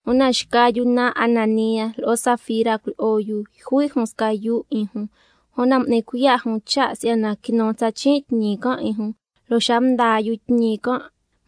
Una xca yu naan Ananía lo'o Safira cuilyi'o yu, yjui' jun sca yuu 'in jun, una m'ni cuiya' jun cha' si'yana quinu tsa chin' tñi can' 'in jun, lo' xa mdaa yu tñi can'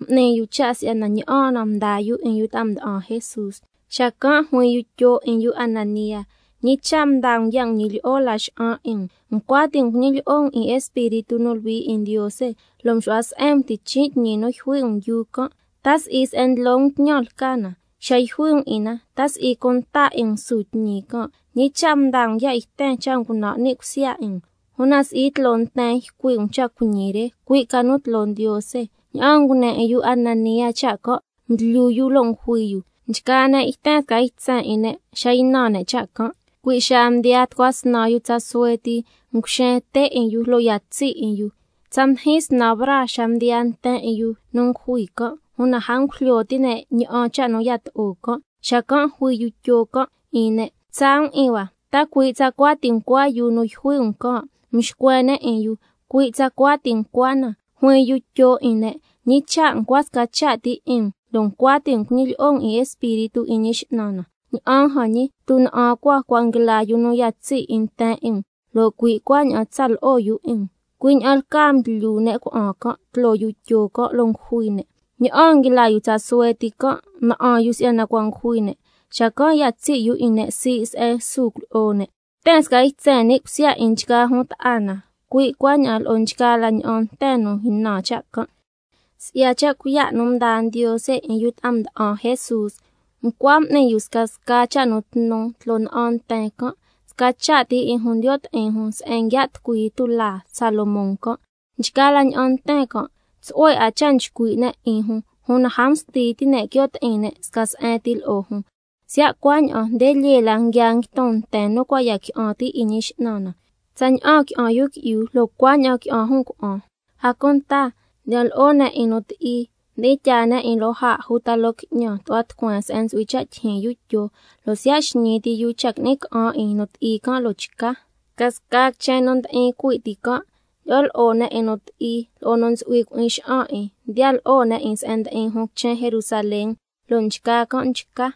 m'ni yu cha' si'yana ña'aan na mdaa yu 'in yu ta'a mda'an Jesús. Xacan' juin yu Tyo 'in yu Ananía: ¿Ñi cha' mdaa um ya' nguñi lyi'o Laxa'an 'in um, ncua ti' um cuñilyi'o um 'in Espíritu nu Luhui 'in Ndiose, lo' mxu'hua se'en um tichin' tñi nu yjui' um yuu can'? ¿Ta si'i se'en ndlo ca um tñan lca na? Xa yjui' um 'in na, ¿ta si'i cunta 'in um su tñi can'? ¿Ñi cha' mdaa um ya' yten cha' ngunan' ni' cusya 'in um? Una si'i tloo nten ycui' um cha' cuiñi re, cui' ca nu tloo Ndiose. Ña'aan ngune 'in yu Ananía cha' can' mdlyu yu lo' ngujui yu. Nchgaa ne' yten sca ytsen 'in ne' xa ynan ne' cha' can'. Cui' xaa mdiyaa tucua snan yu tsa suhue ti, nguxen te' 'in yu lo' ya tsi' 'in yu. Tsa mdijin snan braa xa mdiyaan nten 'in yu nu ngujui can', una a ngujlyo ti' ne' ña'an cha' nu yato'o can'. Xacan' juin yu Tyo can' 'in ne': Quitsa' um 'in hua, ¿ta cui' tsacua ti ncua yuu nu yjui' um can'? Mxcuen ne' 'in yu: Cui' tsacua ti ncua na. Juin yu Tyo 'in ne': ¿Ñi cha' ncua sca cha' ti 'in um lo' ncua ti' um cuñilyi'o um 'in Espíritu 'in Ñi X'nan na? Ña'an jan ñi, tuna'an cua cua' nguila yu nu ya tsi' 'in nten 'in um, lo' cui' cuaña'an tsa lo'o yu 'in um. Cui' ña'an lcaa mdlyu ne' cuna'an can' tloo yu Tyo can', lo' ngujui ne'. Ña'aan nguila yu tsa suhue ti can' na'an yu si'yana cua' ngujui ne'. Xacan' ya tsi' yu 'in ne' sii' se'en su cuilyi'o ne'. Yten sca ytsen ni' cusya 'in nchgaa jun ta'a na, cui' cuaña'an lo'o nchgaa la ña'an nten nu ynan cha' can'. Si'ya cha' cuiya' nu mdaa Ndiose 'in yu ta'a mda'an Jesús, ncua m'ni yu scasca cha' nu tnu tloo na'an nten can', sca cha' ti 'in jun ndiyo' ti'in jun se'en nguia' tucui tulaa Salomón can'. Nchgaa la ña'an nten can' tsu'hue 'a cha' nchcui' ne' 'in jun, una a msti ti' ne' quio' ti'in ne' sca se'en ti lo'o jun, siya' cuaña'an nde lyee la nguia nguiton nten nu cua' ya qui'an ti' 'in Ñi X'nan na, tsaña'an qui'an yu qui'yu lo' cuaña'an qui'an jun cuna'an. A cunta ndyi'an lo'o ne' 'in nu ti'i, mdi'in tyaa ne' 'in loo jaa' uta loo qui'ñan tu'hua tucueen se'en ntsu'hui cha' tyijyin yu Tyo, lo' siya' xñii ti yu cha' qui'ni ca'an 'in nu ti'i can', lo' nchca. Scasca quichen nu ndi'in cui' ti can', ndyi'o lo'o ne' 'in nu ti'i lo'o nu ntsu'hui cui'in xa'an 'in, mdiya lo'o ne' 'in se'en ndi'in jun quichen Jerusalén, lo' nchgaa can' mchca.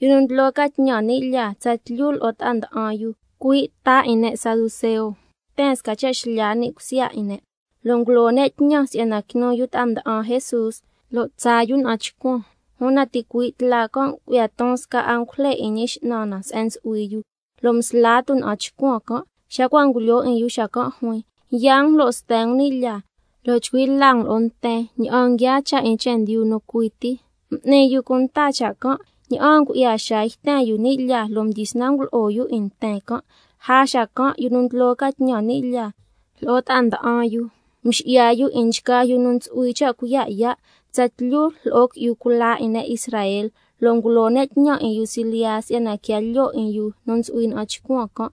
Yu nu ndlo ca tñan ni' lyaa tsatlyu lo'o ta'a nda'an yu, cui' ta 'in ne' Saduceo, yten sca cha' xlya ni' cusya 'in ne', lo' ngulo ne' tñan si'yana quinu yu ta'a mda'an Jesús, lo' tsaa yu na'an chcuan. Una ticui' tla can' ngu'ya ton sca angujle 'in Ñi X'nan na se'en ntsu'hui yu, lo' msla tuna'an chcuan can', xa cua' ngulyoo 'in yu xacan' juin: Yaa um lo' sten um ni' lyaa, lo' chcui' la um lo'o nten ña'an nguiaa cha' 'in chendyu nu cui ti. M'ni yu cunta cha' can', lo' ña'aan ngu'ya xaa yten yu ni' lyaa, lo' mdyisnan ngulo'o yu 'in nten can'. Una lja xacan', yu nu ndlo ca tñan ni' lyaa lo'o ta'a nda'an yu, mxi'ya yu 'in nchgaa yu nu ntsu'hui cha' cuiya' yaa', tsatlyu lo'o qui'yu cula 'in ne' Israel, lo' ngulo ne' tñan 'in yu silyiya si'yana quia lyoo yu 'in yu nu ntsu'hui ña'an chcuan can'.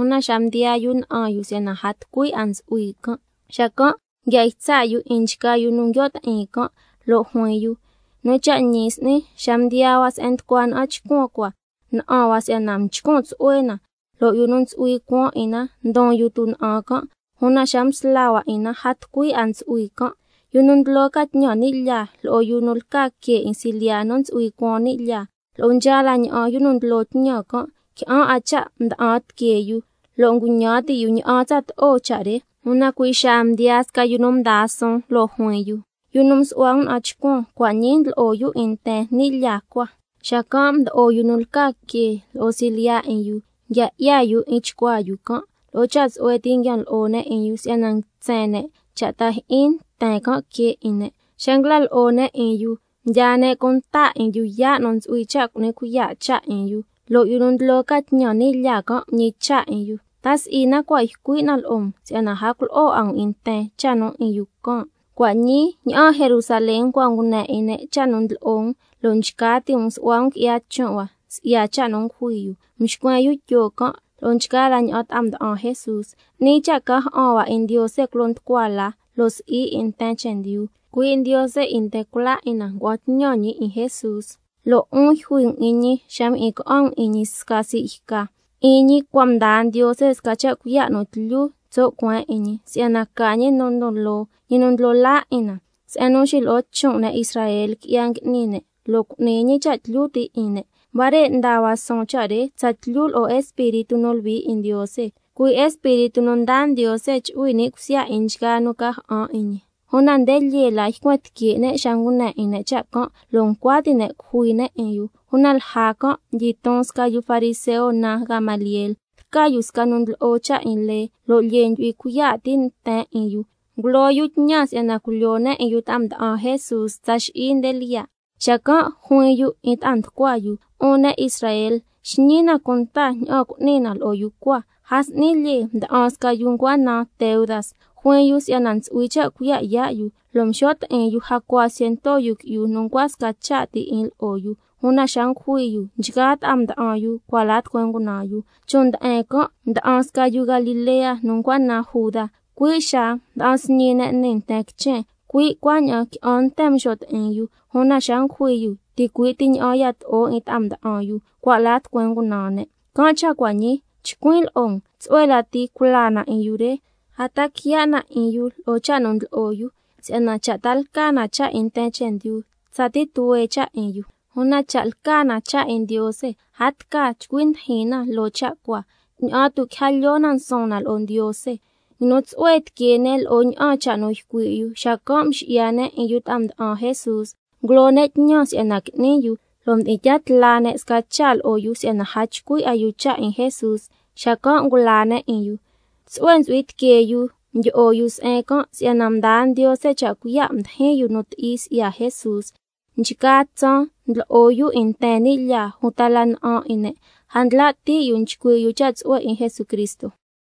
Una xa mdiyaa yu na'an yu si'yana a tucui 'a ntsu'hui can', xacan' nguia ytsa' yu 'in nchgaa yu nu nguio' ti'in can', lo' juin yu: Nu cha' ñi s'ni, xa mdiyaa hua se'en nducua na'an chcuan cua, na'an hua si'yana nchcun tsu'hue na, lo' yu nu ntsu'hui cuan 'in na ndon yu tuna'an can', una xa msla hua 'in na, a tucui 'a ntsu'hui can'. Yu nu ndlo ca tñan ni' lyaa lo'o yu nu lca que 'in silyiya nu ntsu'hui cuan ni' lyaa, lo'o nchgaa la ña'an yu nu ndlo tñan can', qui'an 'a cha' mda'an tiquee yu, lo' nguñan ti' yu ña'an tsato'o cha' re. Una cui' xaa mdiyaa sca yu nu mdaa suun, lo' juin yu: Yu nu msu'hua um na'an chcuan, cua' ñii ndlo'o yu 'in nten ni' lyaa cua. Xacan' mdo'o yu nu lca que lo'o silyiya 'in yu, nguia 'ya yu 'in chcuaa yu can', lo'o cha' tsu'hue ti nguian lo'o ne' 'in yu, si'yana nguitsen ne' cha' ta jyi'in nten can' quee 'in ne'. Xa nguila lo'o ne' 'in yu, mdyaa ne' cunta 'in yu yaa' nu ntsu'hui cha' cu'ni cuiya' cha' 'in yu, lo' yu nu ndlo ca tñan ni' lyaa can' mñicha' 'in yu: ¿Ta si'i na cua' ycui' na lo'o um si'yana a culo'o 'a um 'in nten cha' 'in yu can'? Cua' ñii, ña'aan Jerusalén cua' ngune 'in ne' cha' nu ndlo'o um, lo' nchca ti' um su'hua um qui'ya chon' hua si'ya cha' nu ngujui yu. Mxcuen yu Tyo can' lo'o nchgaa la ña'an ta'a mda'an Jesús: 'Ni cha' ca ja'an hua 'in Ndiose culo nducua la, lo' si'i 'in nten chendyu. Cui' Ndiose 'in nten cula 'in na ngua'an tñan ñi 'in Jesús, lo' 'un yjui um 'in ñi xa mjyi'in ca'an um 'in ñi sca sii' yca. 'In ñi cua' mdaa Ndiose sca cha' cuiya' nu tlyu tso' cueen 'in ñi, si'yana ca Ñi nu ndon loo, Ñi nu ndlo laa 'in na, se'en nu xilo'o chon' ne' Israel qui'ya ngui'ni ne', lo' cu'ni ñi cha' tlyu ti' 'in ne'. Huare' ndaa hua suun cha' re tsatlyu lo'o Espíritu nu Luhui 'in Ndiose, cui' Espíritu nu ndaa Ndiose chu'hui ni' cusya 'in nchgaa nu ca ja'an 'in ñi. Una nde lyee la ycuen tique' ne' xa ngune 'in ne' cha' can', lo' ncua ti' ne' cujui ne' 'in yu. Una lja can' mdyiton sca yu fariseo naan Gamaliel, lca yu sca nu ndlo'o cha' 'in lee, lo' lyee ndyu'hui cuiya' ti' nten 'in yu. Ngulo yu tñan si'yana culyoo ne' 'in yu ta'a mda'an Jesús tsa xi'i nde lyiya', xacan' juin yu 'in ta'a nducua yu: 'Un ne' Israel, xñi na cunta ña'an cu'ni na lo'o yu cua. A s'ni lyee mda'an sca yu ncua naan Teudas, juin yu si'yana ntsu'hui cha' cuiya' yaa' yu, lo' mxo' ti'in yu jacua ciento yu qui'yu nu ncua sca cha' ti 'in lo'o yu, una xa ngujui yu, nchgaa ta'a mda'an yu cua' la tucueen ngunaan yu. Chon' nde'en can' mda'an sca yu Galilea nu ncua naan Juda, cui' xa mda'an sñi ne' nii nten quichen, cui' cuaña'an qui'an nten mxo' ti'in yu, una xa ngujui yu ticui' ti ña'an yato'o 'in ta'a mda'an yu, cua' la tucueen ngunaan ne'. Can' cha' cua' ñii chcuin' lo'o um: Tsu'hue lati culaa na 'in yu re, a ta quiya' na 'in yu lo'o cha' nu ndlo'o yu, si'yana cha' ta lca na cha' 'in nten chendyu, tsatii tuhue cha' 'in yu. Una cha' lca na cha' 'in Ndiose, a tca chcui ndijin na loo cha' cua, ña'an tu' quija lyoo na nsuun na lo'o Ndiose. Nguinu tsu'hue tiquee ne' lo'o ña'an cha' nu ycui' yu. Xacan' mxi'ya ne' 'in yu ta'a mda'an Jesús, ngulo ne' tñan si'yana qui'ni yu lo' mdi'in tyaa tla ne' sca cha' lo'o yu si'yana a chcui' a yu cha' 'in Jesús, xacan' ngulaa ne' 'in yu. Tsu'hue ntsu'hui tiquee yu mdyi'o yu se'en can' si'yana mdaa Ndiose cha' cuiya' mdijin yu nu ti'i si'ya Jesús. Nchgaa tsaan ndlo'o yu 'in nten ni' lyaa uta la na'an 'in ne', a ndla' ti' yu nchcui' yu cha' tsu'hue 'in Jesucristo.